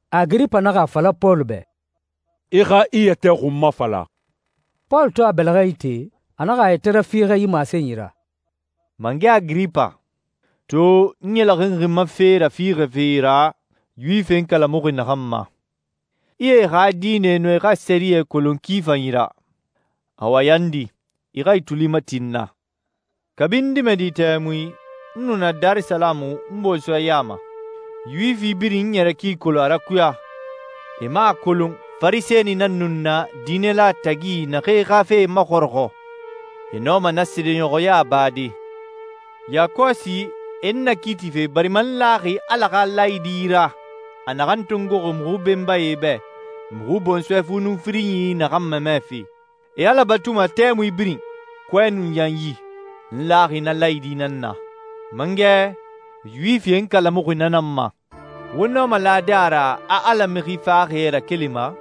Agiripa naxa a fala Pɔlu bɛ, «I xa i yɛtɛ xun mafala.» Pɔlu to a bɛlɛxɛ ite, a naxa a yɛtɛ rafiixɛ yi masenyi ra. «Mangɛ Agiripa, to n ɲɛlɛxinxi n ma fe rafiixɛfe ra Yuwifie n kalamuxi naxan ma. I e xa diinɛ nun e xa sɛriyɛ kolon ki fanyi ra. Awa yandi, i xa i tuli mati n na. Kabi n dimɛdi tɛmui, n nu na Darisalamu n bɔnsɔɛ ya ma. Yuwifi birin n ɲɛrɛ ki kolon a rakuya. E man a kolon Farisɛni nan nu n na diinɛla tagi naxee xa fe maxɔrɔxɔ. E nɔma na seedeɲɔxɔya bade. Yakɔsi, e n nakiitife barima n laxi Ala xa laayidi ra a naxan tongoxi muxu benbae bɛ, muxu bɔnsɔɛ fu nun firinyi naxan mamɛfe. E Ala batuma tɛmui birin, kɔɛ nun yanyi. N laxi na laayidi nan na. Mangɛ, Yuwifie n kalamuxi na nan ma. Wo nɔma lade a ra a Ala mixi faxaxie rakelima?»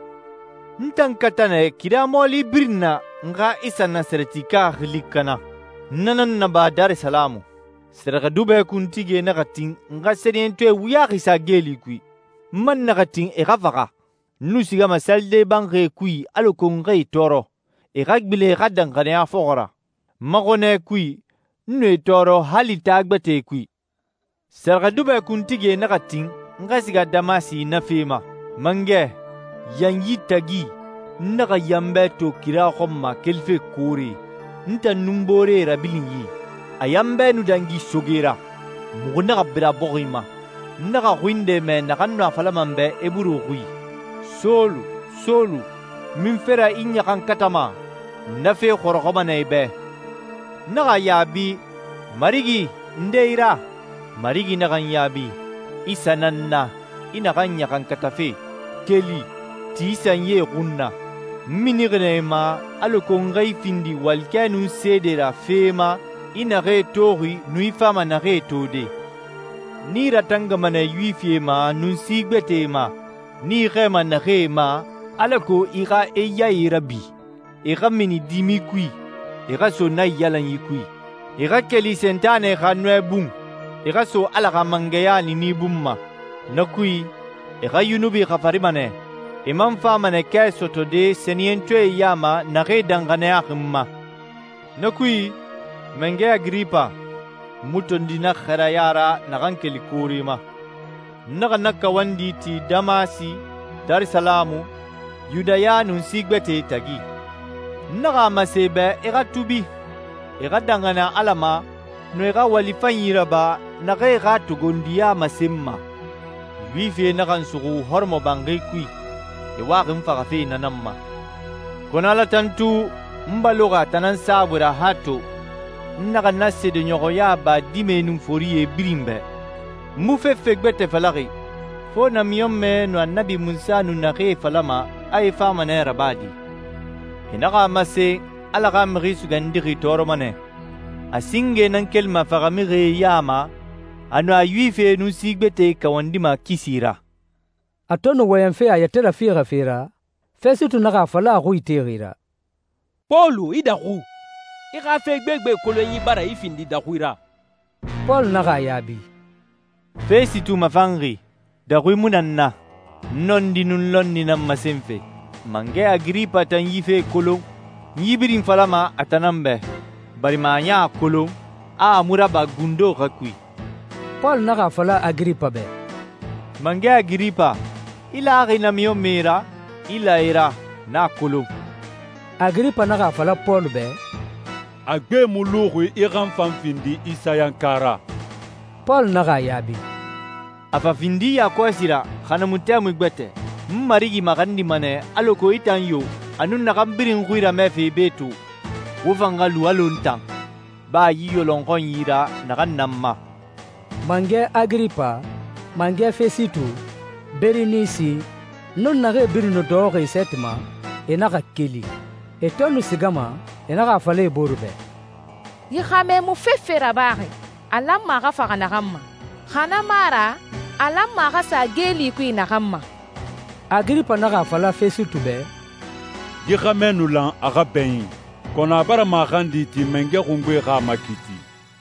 «N tan kata nɛ kira mɔɔli birin na n xa Isa Nasarɛtika xili kana. N na nan naba Darisalamu. Sɛrɛxɛdubɛ kuntigie naxa tin n xa sɛniyɛntɔɛ wuyaxi sa geeli kui. N man naxa tin e xa faxa. N nu sigama salide banxie kui alako n xa e tɔɔrɔ, e xa gbilen e xa danxaniya fɔxɔ ra. N ma xɔnɛ kui, n nu e tɔɔrɔ hali taa gbɛtɛe kui.» «Sɛrɛxɛdubɛ kuntigie naxa tin n xa siga Damasi na fe ma. Mangɛ, yanyi tagi n naxa yanbɛ to kira xɔn ma kelife koore, n tan nun n booree rabilinyi. A yanbɛ nu dangi soge ra. Muxu naxa bira bɔxi ma. N naxa xui nde mɛ naxan nu a falama n bɛ Eburu xui, ‹Sɔlu, Sɔlu, munfe ra i n ɲaxankatama? Na fe xɔrɔxɔma nɛ i bɛ.› N naxa a yaabi, ‹Marigi, nde i ra?› Marigi naxa n yaabi, ‹Isa nan n na, i naxan ɲaxankatafe. Keli, ti i sanyie xun na. N minixi nɛ i ma alako n xa i findi walikɛ nun seede ra fee ma i naxee toxi nun i fama naxee tode. N i ratangama nɛ Yuwifie ma nun si gbɛtɛe ma, n i xɛɛma naxee ma, alako i xa e yae rabi, e xa mini dimi kui, e xa so naiyalanyi kui. E xa keli Sentanɛ xa nɔɛ bun, e xa so Ala xa mangɛya niini bun ma. Na kui, e xa yunubi xafarima nɛ, e man fama nɛ kɛ sɔtɔde sɛniyɛntɔɛe ya ma naxee danxaniyaxi n ma.›» «Na kui, mangɛ Agiripa, n mu tondi na xɛɛraya ra naxan keli koore ma. N naxa na kawandi ti Damasi, Darisalamu, Yudaya, nun si gbɛtɛe tagi. N naxa a masen e bɛ e xa tuubi, e xa danxaniya Ala ma, nun e xa wali fanyi raba naxan e xa togondiya masenma.» «Yuwifie naxa n suxu hɔrɔmɔbanxi kui, e waxi n faxafe na nan ma. Kɔnɔ, Ala tantu, n baloxi a tan nan saabui ra han to. N naxa na seedeɲɔxɔya ba dimɛe nun forie birin bɛ. N mu fefe gbɛtɛ falaxi fo namiɲɔnmɛe nun Annabi Munsa nu naxee falama a e fama nɛ rabade. E naxa a masen Ala xa Mixi Sugandixi tɔɔrɔma nɛ, a singe nan kelima faxamixie ya ma, a nun a Yuwifie nun si gbɛtɛe kawandima kisi ra.» A to nu wɔyɛnfe a yɛtɛ rafiixɛfe ra, Fɛsitu naxa a fala a xui itexi ra, «Pɔlu, i daxu! I xa fe gbegbe kolonyi bara i findi daxui ra.» Pɔlu naxa a yaabi, «Fɛsitu mafanxi, daxui mu na n na. N nɔndi nun lɔnni nan masenfe. Mangɛ Agiripa tan yi fee kolon. N yi birin falama a tan nan bɛ, barima a ɲan a kolon, a a mu raba gundo xa kui.» Pɔlu naxa a fala Agiripa bɛ, «Mangɛ Agiripa, i laxi namiɲɔnmɛe ra? I la e ra, n na kolon.» Agiripa naxa a fala Pɔlu bɛ, «A gbe mu luxi i xa n fan findi Isayanka ra!» Pɔlu naxa a yaabi, «A fa findi yakɔsi ra, xa na mu tɛmui gbɛtɛ, n Marigi maxandima nɛ alako i tan yo, a nun naxan birin n xui ramɛfe be to, wo fan xa lu alɔ n tan, ba yi yɔlɔnxɔnyi ra naxan na n ma.» Mangɛ Agiripa, mangɛ Fɛsitu, Berinisi, nun naxee birin nu dɔxɔxi e sɛɛti ma, e naxa keli. E to nu sigama, e naxa a fala e bore bɛ, «Yi xɛmɛ mu fefe rabaxi a lanma a xa faxa naxan ma, xa na mu a ra a lanma a xa sa geeli kui naxan ma.» Agiripa naxa a fala Fɛsitu bɛ, «Yi xɛmɛ nu lan a xa bɛɲin, kɔnɔ a bara maxandi ti Mangɛ Xungbe xa a makiiti.»